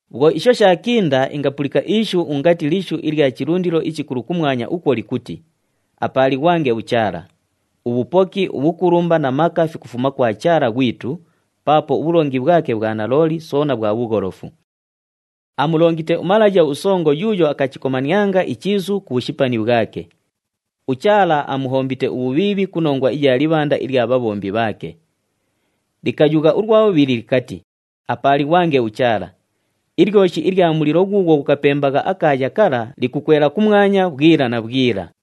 Bhwo isho shaakinda, ingapulika ishu ungati lishu ilya chilundilo ichikulu kumwanya ukwo likuti, “Apaalighwange uChaala! Ubhupoki, ubhukulumba na maka fikufuma kwa Chaala ghwitu, paapo ubhulongi bhwake bhwa nalooli soona bhwa bhugholofu. Aamulongite umalaya usongo yuuyo akachikomanianga ichiisu ku bhushipani bhwake. UChaala amuhombite ubhubhiibhi ku nongwa iya libhanda ilya bhabhombi bhaake.” Likayugha ulwa bhubhili likati, “Apaalighwange uChaala! Ilyoshi ilya mulilo ghuughwo ghukapembagha akaaya kala likukwela kumwanya bhwila na bhwila.”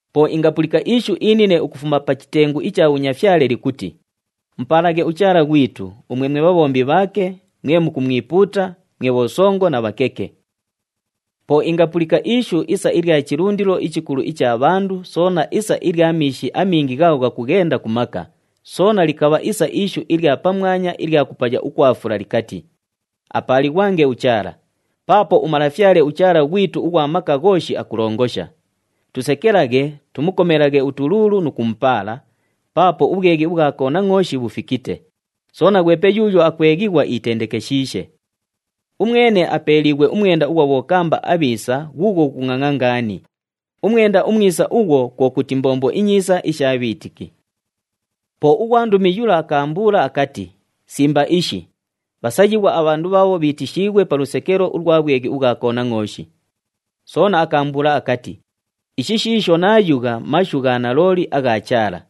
Po ingapulika ishu inine ukufuma pa chitengu icha bhunyafyale likuti, “Mupaalaghe uChaala ghwitu, umwe mwe bhabhombi bhaake, mwe mukumwipuuta, mwe bhosongo na bhakeke!” Po ingapulika ishu isa ilya chilundilo ichikulu icha bhandu, soona isa ilya miishi amingi ghaagho ghakughenda ku maka, soona likabha isa ishu ilya pamwanya ilya kupaya ukwa fula likati, “Apaalighwange uChaala! Paapo uMalafyale uChaala ghwitu ughwa Maka Ghooshi akulongosha. Tusekelaghe, tumukomelaghe utuluulu nu kumupaala, paapo ubhweghi ubhwa Konangʼooshi bhufikite, soona ghwepe yuuyo akweghighwa iitendekeshiishe. Umwene apeeliighwe umwenda ughwa bhokamba abhiisa ghuughwo ghukungʼangʼa ngaani.” Umwenda umwisa ughwo, kwo kuti mbombo inyiisa isha bhiitiki. Po ughwandumi yula akaambuula akati, “Simba ishi! Bhasayighwa abhandu bhaabho bhiitishiighwe pa lusekelo ulwa bhweghi ubhwa Konangʼooshi.” Soona akaambuula akati, “Ishi shiisho naayugha mashu gha nalooli agha Chaala.”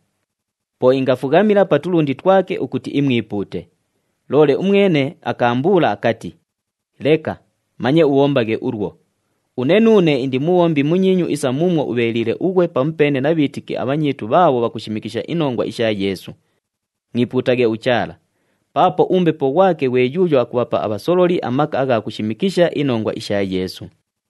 Po ingafughamila pa tulundi twake ukuti imwipuute. Loole umwene akaambuula akati, “Leka! Manye ubhombaghe ulwo! Une nuune indi mubhombi munyiinyu isa muumwo ubheeliile ughwe pamupeene na bhiitiki abhanyiinyu bhaabho bhakushimikisha inongwa isha Yeesu. Mwipuutaghe uChaala! Paapo uMbepo ghwake ghwe yuuyo akubhapa abhasololi amaka agha kushimikisha inongwa isha Yeesu.”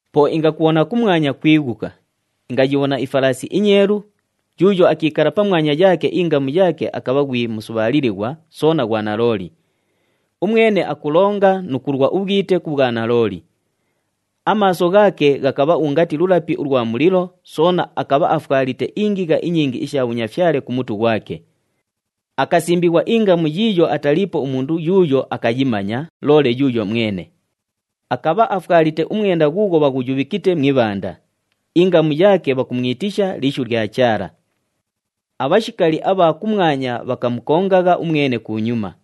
Po ingakubhona kumwanya kwighuka. Ingayibhona ifalaasi inyeelu, yuuyo akiikala pamwanya yaake ingamu yaake akabha ghwi “Musubhaalilighwa,” soona “Ghwa Nalooli.” Umwene akulonga nu kulwa ubhwite ku bhwanalooli. Amaaso ghaake ghakabha ungati lulapi ulwa mulilo, soona akabha afwalite ingigha inyingi isha bhunyafyale ku mutu ghwake. Akasimbighwa ingamu yiiyo ataliipo umundu yuuyo akayimanya, loole yuuyo mwene. Akabha afwalite umwenda ghuughwo bhaghuyubhikite mu ibhanda. Ingamu yaake bhakumwitisha, “Lishu lya Chaala.” Abhashikali abha kumwanya bhakamukongagha umwene kunyuma.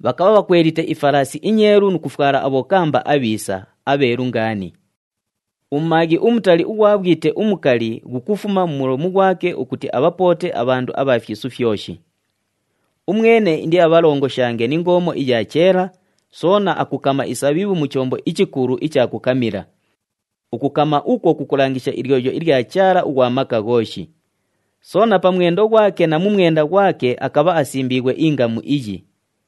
Bhakabha bhakwelite ifalaasi inyeelu nu kufwala abhokamba abhiisa, abheelu ngaani. Umumaaghi umutali ughwa bhwite umukali ghukufuma mu mulomu ghwake ukuti abhapoote abhandu abha fyisu fyoshi. “Umwene indiabhalongoshange ni ngoomo iya cheela,” soona akukama isabhibhu mu chombo ichikulu icha kukamila. Ukukama ukwo kukulangisha ilyoyo ilya Chaala ughwa Maka Ghooshi. Soona pa mwendo ghwake na mu mwenda ghwake akabha asimbiighwe ingamu iyi,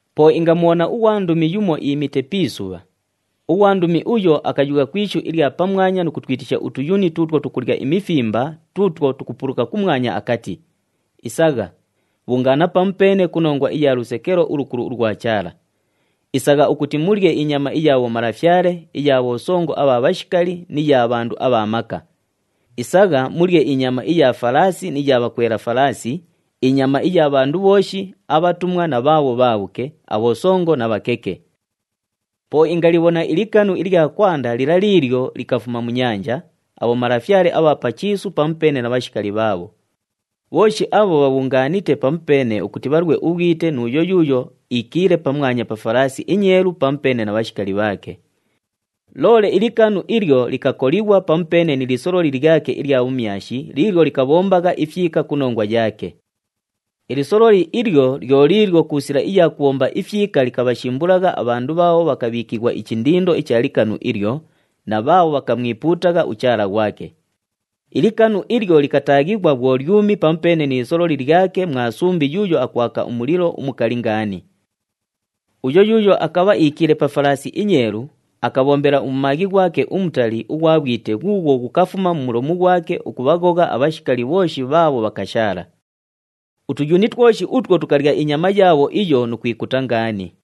Po ingamubhona ughwandumi yumo iimite pi isubha. Ughwandumi uyo akayugha ku ishu ilya pamwanya nu kutwitisha utuyuni tuutwo tukulya imifimba tuutwo tukupuluka kumwanya akati, “Isagha, bhungaana pamupeene ku nongwa iya lusekelo ulukulu ulwa Chaala. Isagha ukuti mulye inyama iya bhomalafyale, iya bhosongo abha bhashikali ni ya bhandu abha maka. Isagha mulye inyama iya falaasi ni ya bhakwela falaasi, inyama iya bhandu bhooshi, abhatumwa na bhaabho bhaabhuke, abhosongo na bhakeke.” Po ingalibhona ilikanu ilya kwanda lila liilyo likafuma mu nyanja, abhomalafyale abha pa chiisu pamupeene na bhashikali bhaabho. Bhooshi abho bhabhungaanite pamupeene ukuti bhalwe ubhwite nu uyo yuuyo iikiile pamwanya pa falaasi inyeelu pamupeene na bhashikali bhaake. Loole ilikanu ilyo likakolighwa pamupeene ni lisololi lyake ilya bhumyashi liilyo likabhombagha ifyika ku nongwa yaake. Ilisololi ilyo lyo liilyo ku sila iya kubhomba ifyika likabhashimbulagha abhandu bhaabho bhakabhiikighwa ichindindo icha likanu ilyo, na bhaabho bhakamwipuutagha uchaala ghwake. Ilikanu ilyo likataaghighwa bhwo lyumi pamupeene ni lisololi lyake mwa sumbi yuuyo akwaka umulilo umukali ngaani. Uyo yuuyo akabha iikiile pa falaasi inyeelu, akabhombela umumaaghi ghwake umutali ughwa bhwite ghuughwo ghukafuma mu mulomu ghwake, ukubhaghogha abhashikali bhooshi bhaabho bhakashaala. Utuyuni twoshi utwo tukalya inyama yaabho iyo nu kwikuta ngaani.